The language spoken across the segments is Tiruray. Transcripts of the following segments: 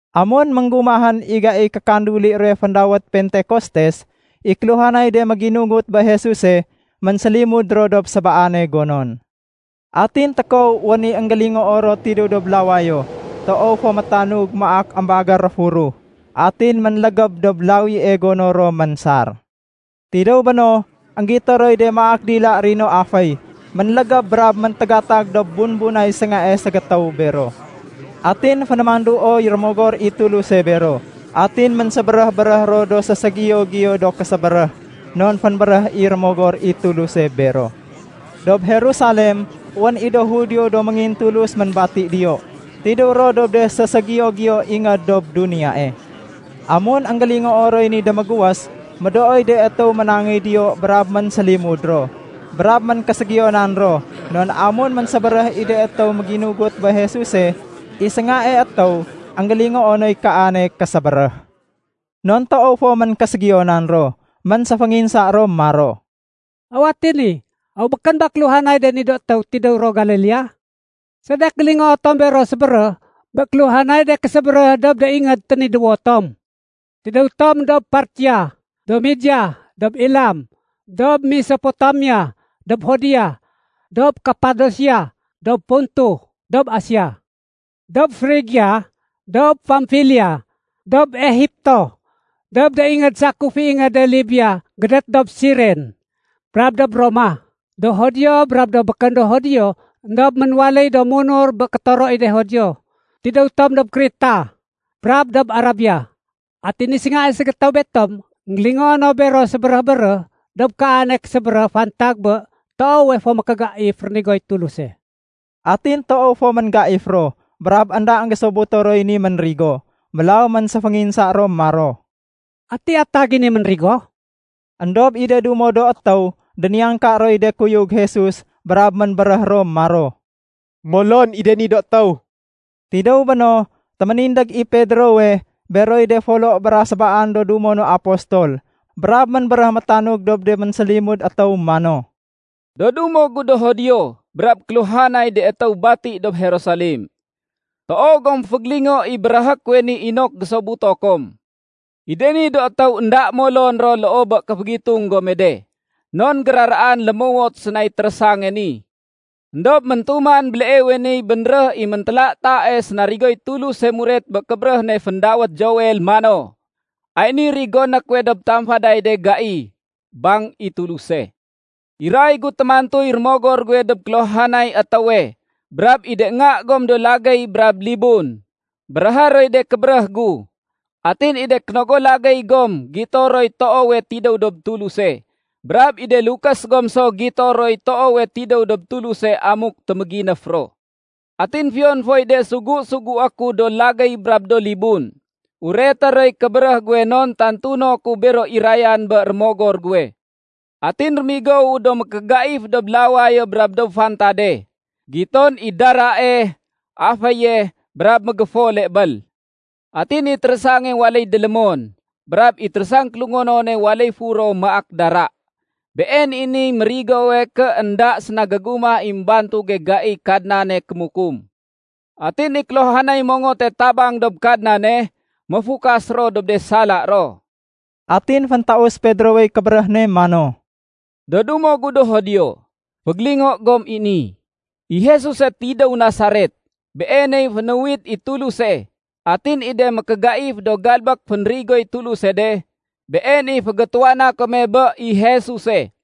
Amun énggumahén i gaiy kékanduli ruwe féndawét Pentekostes, i kéluhanay de méginugut bé Jesuse, ménsélimud ro dob sébaane gonon. Atin tékow wén i énggélingoo ro tidéw dob lawayo toow fo métanug maak émbagér réfuruh. Atin ménlégéb dob lawie gono ro ménsar. Tidéw béno, énggito roy de maak dila rino aféy ménlégéb brab méntégatag dob bumbunay séngae ségétéw bero. Atin fénémanduoy Rémogor i Tuluse bero. Atin ménsébéréh-béréh ro do séségiyo-giyo do késébéréh non fénbéréh i Rémogor i Tuluse bero. Dob Jerusalem, wén i do Judio do méngintulus ménbati diyo. Tidéw ro dob de séségiyo-giyo ingéd dob duniyae. Amun énggélingoo roy ni démégués, médooy de étéw ménangéy diyo brab ménsélimud ro. Brab ménkéségiyonan ro non amun ménsébéréh i de étéw méginugut bé Jesuse, i séngae étéw énggélingoo noy kaane késébéréh. Non toow fo ménkéségiyonan ro, ménséfénginsa ro maro, “Aw ati ni? Aw békén ba kéluhanay de ni do étéw tidéw ro Galilea? Sedek gélingoo tom bero sébéréh bé kéluhanay de késébéréh dob de ingéd ténidéwo tom? Tidéw tom dob Partia, dob Media, dob Elam, dob Mesopotamia, dob Judea, dob Kapadosia, dob Ponto, dob Asia. Dob Frigia, dob Pamfilia, dob Egipto, dob de ingéd sakuf i ingéde Libia gédét dob Siren, brab dob Roma, do Judio brab do békén do Judio éndob ménwaléy do munur bé kétoro i de Judio. Tidéw tom dob Kreta, brab dob Arabia. Atin i séngae ségétéw betom énggélingoo no bero sébéréh-béréh dob kaane késébéréh fantag bé toowe fo mékégaif rénigoy Tuluse.” Atin toow fo ménggaif ro brab énda énggésobuto roy ni ménrigo. Mélaw ménséfénginsa ro maro, “Ati atag i ni ménrigo?” Endob i de dumo do étéw déniyangka roy de kuyug Jesus brab ménbéréh ro maro, “Molon i de ni do étéw.” Tidéw béno, téménindég i Pedrowe beroy de folo bra sébaan do dumo no apostol brab ménbéréh métanug dob de ménsélimud étéw mano, “Do dumo gu do Judio brab kéluhanay de étéw bati dob Jerusalem, toow gom fégélingo i béréhé kuwe ni inok gésobuto kom. I de ni do étéw énda molon ro loo bé kéfégitung gome de, non géraraan lémowot sénay térésange ni. Endob méntuman béleewe niy bénréh i méntélatae sénarigoy Tuluse muret bé kébéréh ne féndawét Joel mano, ‘Ay niy rigoné kuwe dob de tamfaday de gai, bang i Tuluse. Iray gu témantuy Rémogor guwe dob kéluhanay étéwe. Brab i de nga gom do lagéy brab libun, béréhé roy de kébéréh gu. Atin i de kénogo lagéy gom gito roy toowe tidéw dob Tuluse, brab i de lukés gom so gito roy toowe tidéw dob Tuluse amuk téméginéf ro. Atin fiyon foy de sugu-sugué ku, do lagéy brab do libun, ureté roy kébéréh guwe non tantuno ku bero irayan bé Rémogor guwe. Atin rémigowu do mékégaif dob lawayo brab dob fantade. Giton i darae, aféye, brab mégéfole bél. Atin i térésange waléy délémon, brab i térésang kélungonone waléy furo maak dara. Been i niy mérigowe ké énda séna gégumah i émbantuge gaiy Kadnane kémukum. Atin i kéluhanay mongote tabang dob Kadnane, méfukas ro dob de sala ro.’” Atin féntaus Pedrowey kébéréh ne mano, “Do dumo gu do Judio, fégélingo gom i ni! I Jesuse tidéw Nasaret, Beeney fénuwit i Tuluse. Atin i de mékégaif do galbék fénrigoy Tuluse de, been i fégétuwana kome bé i Jesuse,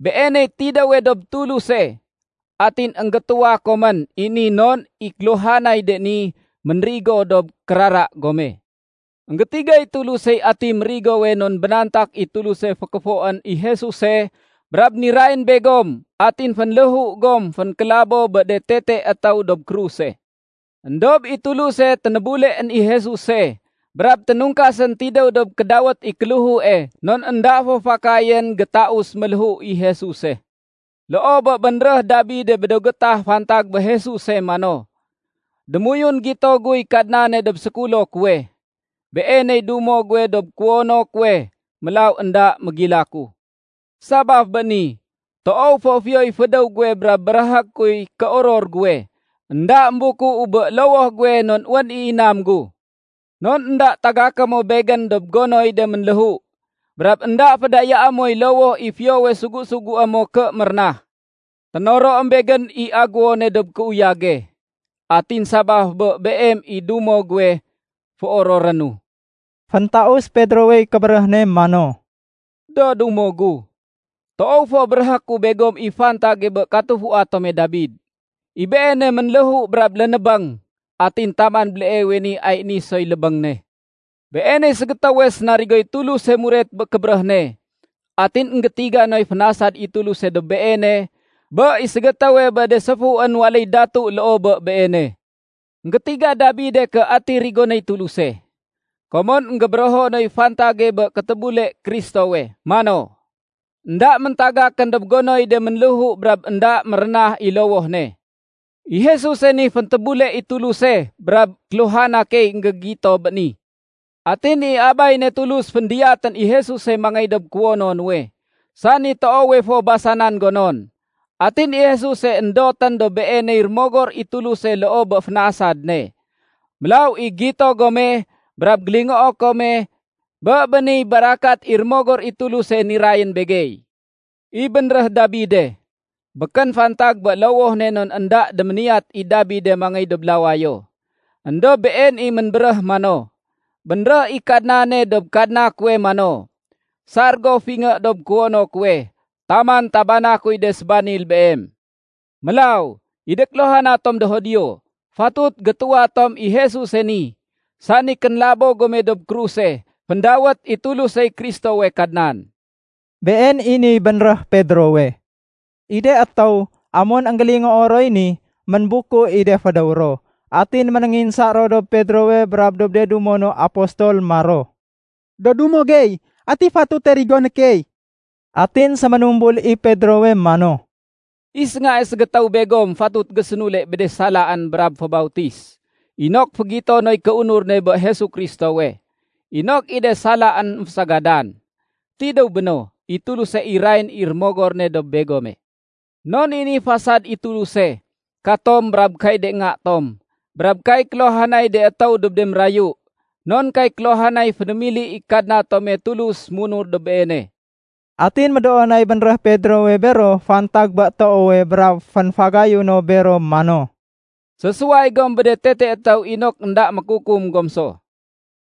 Beeney tidéwe dob Tuluse. Atin énggétuwa komén i ni non i kéluhanay de ni, ménrigo dob kérara gome. Enggétigay Tulusey ati mérigowe non bénantak i Tuluse fékéfoén i Jesuse brab nirayén begom atin fénléhu gom fénkélabo bé de tete étéw dob kruse. Endob i Tuluse ténébuleén i Jesuse brab ténungkasén tidéw dob kédawét i kéléhue non énda fo fakayén gétaus méléhu i Jesuse. “Loo bé bénréh Dabide bé do gétah fantag bé Jesuse mano, ‘Démoyun gito guy Kadnane dob sékulo kuwe, Beeney dumo guwe dob kuwono kuwe, mélaw énda mégilaku. Sabaf bé ni, toow fo fiyoy fédéw guwe brab béréhé kuy kéoror guwe. Enda émbukuu bé lowoh guwe non wén i inam gu. Non énda tagaké mo Begén dob gonoy de ménléhu. Brab énda fédayaé moy lowoh i fiyowe sugu-sugué mo ké mérénah. Ténoroém begén i agéwone dob kéuyage. Atin sabaf bé Beem i dumo guwe, féororénu.’” Féntaus Pedrowey kébéréh ne mano, “Do dumo gu, toow fo béréhé ku begom i fantage bé katufua tome Dabid. I beene ménléhu brab lénébéng, atin taman béleewe ni ay ni soy lébéng ne. Beeney ségétéwe sénarigoy Tuluse muret bé kébéréh ne. Atin énggétiga noy fénasad i Tuluse dob beene bé i ségétéwe bé de séfuén waléy datu loo bé beene. Enggétiga Dabide ké ati rigonéy Tuluse, komon énggébérého noy fantage bé kétébule Kristowe mano, ‘Enda méntagakén dob gonoy de ménléhu brab énda mérénah i lowoh ne.’ I Jesuse ni féntébule i Tuluse, brab kéluhana key énggégito bé ni. Atin i Abay ne Tulus, féndiyatén i Jesuse mangéy dob kuwono nuwe, sani toowe fo basanan gonon. Atin i Jesuse, éndotén dob Beeney Rémogor i Tuluse loo bé fénasad ne. Mélaw i gito gome brab gélingoo kome bé béniy barakat i Rémogor i Tuluse nirayén begey. I bénréh Dabide, békén fantag bé lowoh ne non énda déméniyat i Dabide mangéy dob lawayo, éndob been i ménbéréh mano, ‘Bénréh i Kadnane dob Kadna kuwe mano, sar go fingé dob kuwono kuwe, taman tabana kuy de sébanil Beem.’ Mélaw, i de kéluhana tom do Judio, fatut gétuwa tom i Jesuse ni, sani kénlabo gome dob kruse, féndawét i Tulusey Kristowe Kadnan.” Been i niy bénréh Pedrowe. I de étéw, amun énggélingoo roy ni, ménbuku i de fédéw ro. Atin ménénginsa ro dob Pedrowe brab dob de dumo no apostol maro, “Do dumo gey, ati fatute rigoné key?” Atin séménumbul i Pedrowe mano, “I séngae ségétéw begom fatut gésénule bé de salaén brab fébautis inok fégito noy kéunur ne bé Jesu Kristowe, inok i de salaén émfésagadan. Tidéw béno, i Tuluse irayén i Rémogor ne dob begome. Non i ni fasad i Tuluse, katom brab kay de nga tom, brab kay kéluhanay de étéw dob de mérayu, non kay kéluhanay fénémili i Kadna tome Tulus munur dob Beene.” Atin médoo nay bénréh Pedrowe bero fantag bé toowe brab fénfagayu no bero mano, “Sésuway gom bé de tete étéw inok énda mékukum gom so.”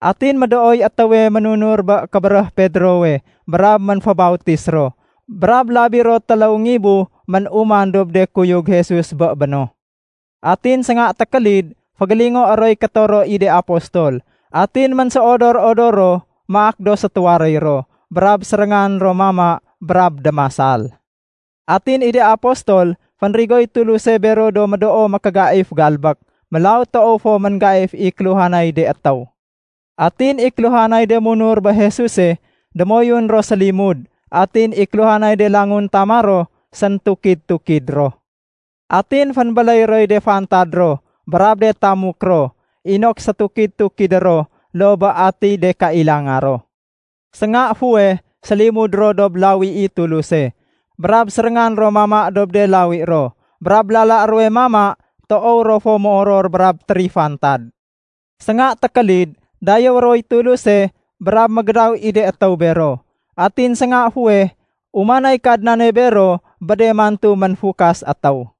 Atin médooy étéwe ménunur bé kébéréh Pedrowe brab ménfébautis ro, brab labi ro téléw ngibu ménuman dob de kuyug Jesus bé béno. Atin sénga tékélid fégélingoé roy kétoro i de apostol, atin ménséodor-odor ro maak do sétuwaréy ro. Brab séréngan ro mama brab démasal. Atin i de apostol, fénrigoy Tuluse bero do médoo mékégaif galbék, mélaw toow fo ménggaif i kéluhanay de étéw. Atin i kéluhanay de munur bé Jesuse, démoyun ro sélimud atin i kéluhanay de languntama ro séntukid-tukid ro. Atin fénbéléy roy de fantad ro brab de tamuk ro inok sétukid-tukidé ro loo bé atiy de kailanga ro. Sénga fuweh sélimud ro dob lawi i Tuluse, brab séréngan ro mama dob de lawi ro. Brab lala ruwe mama, toow ro fo moror brab térifantad. Sénga tékélid dayéwé roy Tuluse brab mégédaw i de étéw bero. Atin sénga fuweh umanay Kadnane bero bé de mantu ménfukas étéw.